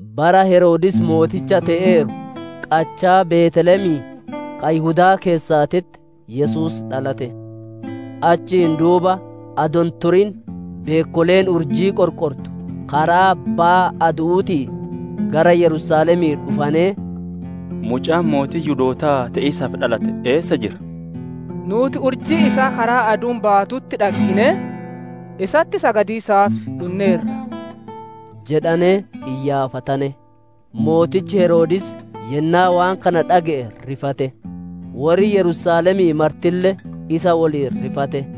Bara Heroodis mooticha te'eeru, qachaa Beeteelemii, ka Yihudaa keessaatitti Yesuus dhalate. Achiin duuba adoo hin turin beekkoleen urjii qorqortu karaa baya adu'uutii gara Yerusaalemii dhufanee, «Mucaan mootii Yihudootaa te'iisaaf dhalate, eessa jira? Nuuti urjii isaa karaa aduun baatutti dhagginee, isatti sagadiisaaf dhunneerra» jedhanee iyyaafatane. Mootichi Heroodis yennaa waan kana dhage'e rifate; worri Yerusaalemii martille isa woliin rifate.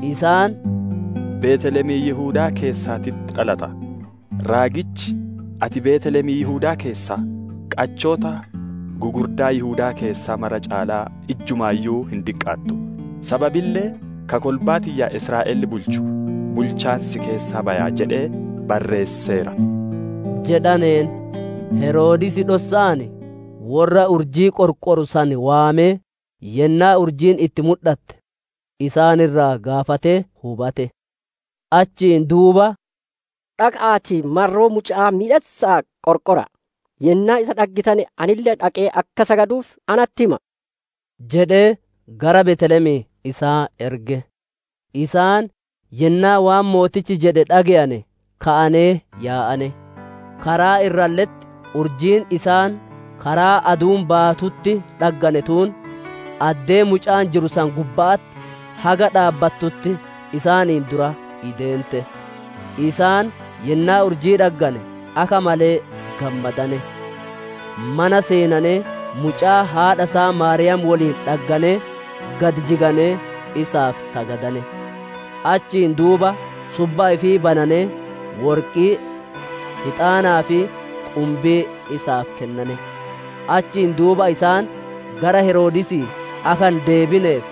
Isaan, «Beeteelemii Yihudaa keessaatitti dhalata; raagichi: «‹Ati Beeteelemiin Yihudaa keessaa! Qachoota gugurdaa Yihudaa keessaa mara caalaa ijjumaayyuu hin diqqaattu; sababille ka kolbaa tiyya Israa'el bulchu bulchaan si keessaa baya› jedhee barreesseera» jedhaneen. Heroodis dhossa'aan worra urjii qorqoru san waamee yennaa urjiin itti mudhatte isaan irraa gaafatee hubate. Achiin duuba, «Dhaqa'aatii, marroo muca'aa miidhassa'aa qorqora'a; yennaa isa dhaggitane, anille dhaqee akka sagaduuf natti hima'a» jedhee, gara Beeteelemii isaan erge. Isaan yennaa waan mootichi jedhe dhage'ane, ka'anee yaa'ane; karaa irralle'etti urjiin isaan karaa aduun baatutti dhaggane tuun, addee mucaan jiru san gubba'atti haga dhaabbattutti isaaniin dura ideente. Isaan yennaa urjii dhaggane, akka malee gammadane. Mana seenanee, mucaa haadha isaa Maariyaam woliin dhagganee, gad jiganee isaaf sagadane. Achiin duuba subba ifii bananee worqii, hixaanaa fi qumbii isaaf kennane. Achiin duuba isaan gara Heroodisii akka hin deebineef,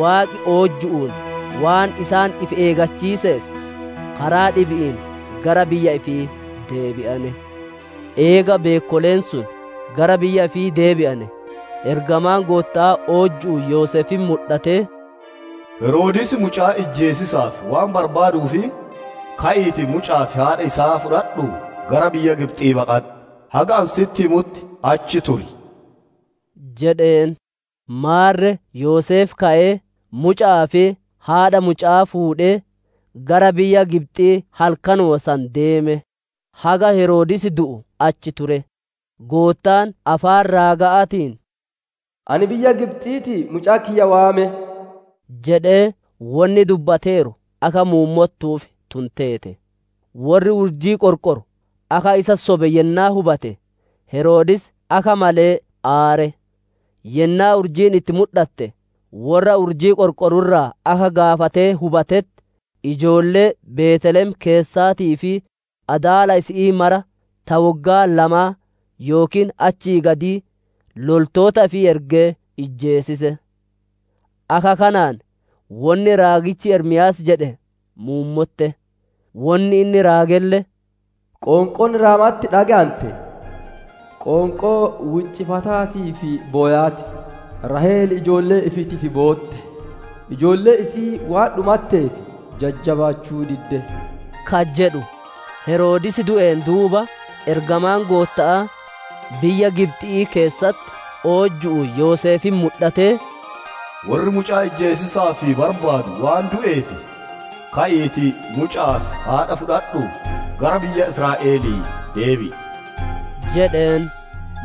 Waaqi oojju'uun waan isaan if eeggachiiseef, karaa dhibi'iin gara biyya ifii deebi'ane. Eega beekkoleen sun gara biyya ifii deebi'ane, ergamaan Gootta'aa oojju'uun Yoseefitti mudhatee, «Heroodis mucaa ijjeesiisaaf waan barbaaduuf, ka'iitii, muca'aa fi haadha isaa fudhadhuu gara biyya Gibxi'ii baqadhu; haga ani sitti himutti achi turi» jedheen. Maarre Yoseef ka'ee, muca'aa fi haadhaa muca'aa fuudhee, gara biyya Gibxi'ii halkanuma san deeme. Haga Heroodis du'u achi ture; Goottaan afaan raaga'aatiin, «Ani biyya Gibxi'iitii mucaa kiyya waame» jedhee wonni dubbateeru akka muummottuuf tun teete. Worri urjii qorqoru akka isa sobe yennaa hubate, Heroodis akka malee aare. Yennaa urjiin itti mudhatte worra urjii qorqoru irraa akka gaafatee hubatetti, ijoollee Beeteelem keessaatii fi adaala isi'ii maraa, ta woggaa lamaa yookiin achii gadii loltoota ifii ergee ijjeesisiise. Akka kanaan wonni raagichi Ermiyaas jedhe muummotte; wonni inni raagelle: «Qoonqoon Raama'atti dhage'ante, qoonqoo wiiccifataa fi bowaa ti. Raahel ijoollee ifiitiif bootte; ijoolleen isi'ii waan dhumatteef, jajjabaachuu didde» ka jedhu. Heroodis du'een duuba, ergamaan Gootta'aa biyya Gibxi'ii keessatti oojju'uun Yoseefitti mudhatee, «Worri mucaa ijjeesiisaaf barbaadu waan du'eef, ka'iitii, muca'aa fi haadha isaa fudhadhuutii, gara biyya Israa'elii deebi'i» jedheen.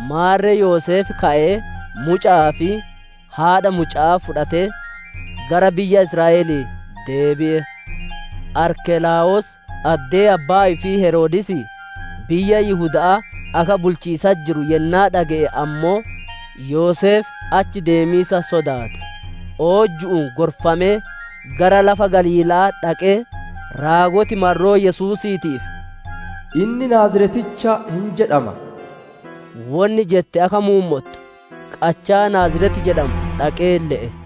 Maarre Yoseef ka'ee, muca'aa fi haadha muca'aa fudhatee, gara biyya Israa'elii deebi'e. Arkelaawoos addee abbaa ifii Heroodisii biyya Yihuda'aa akka bulchiisatti jiru yennaa dhage'e ammoo, Yoseef achi deemiisa sodaate. Oojju'uun gorfamee, gara lafa Galiila'aa dhaqee, raagoti marroo Yesuusiitiif, «Inni Naazireticha hin jedhama» wonni jette akka muummottu qachaa Naaziret jedhamu dhaqee le'e.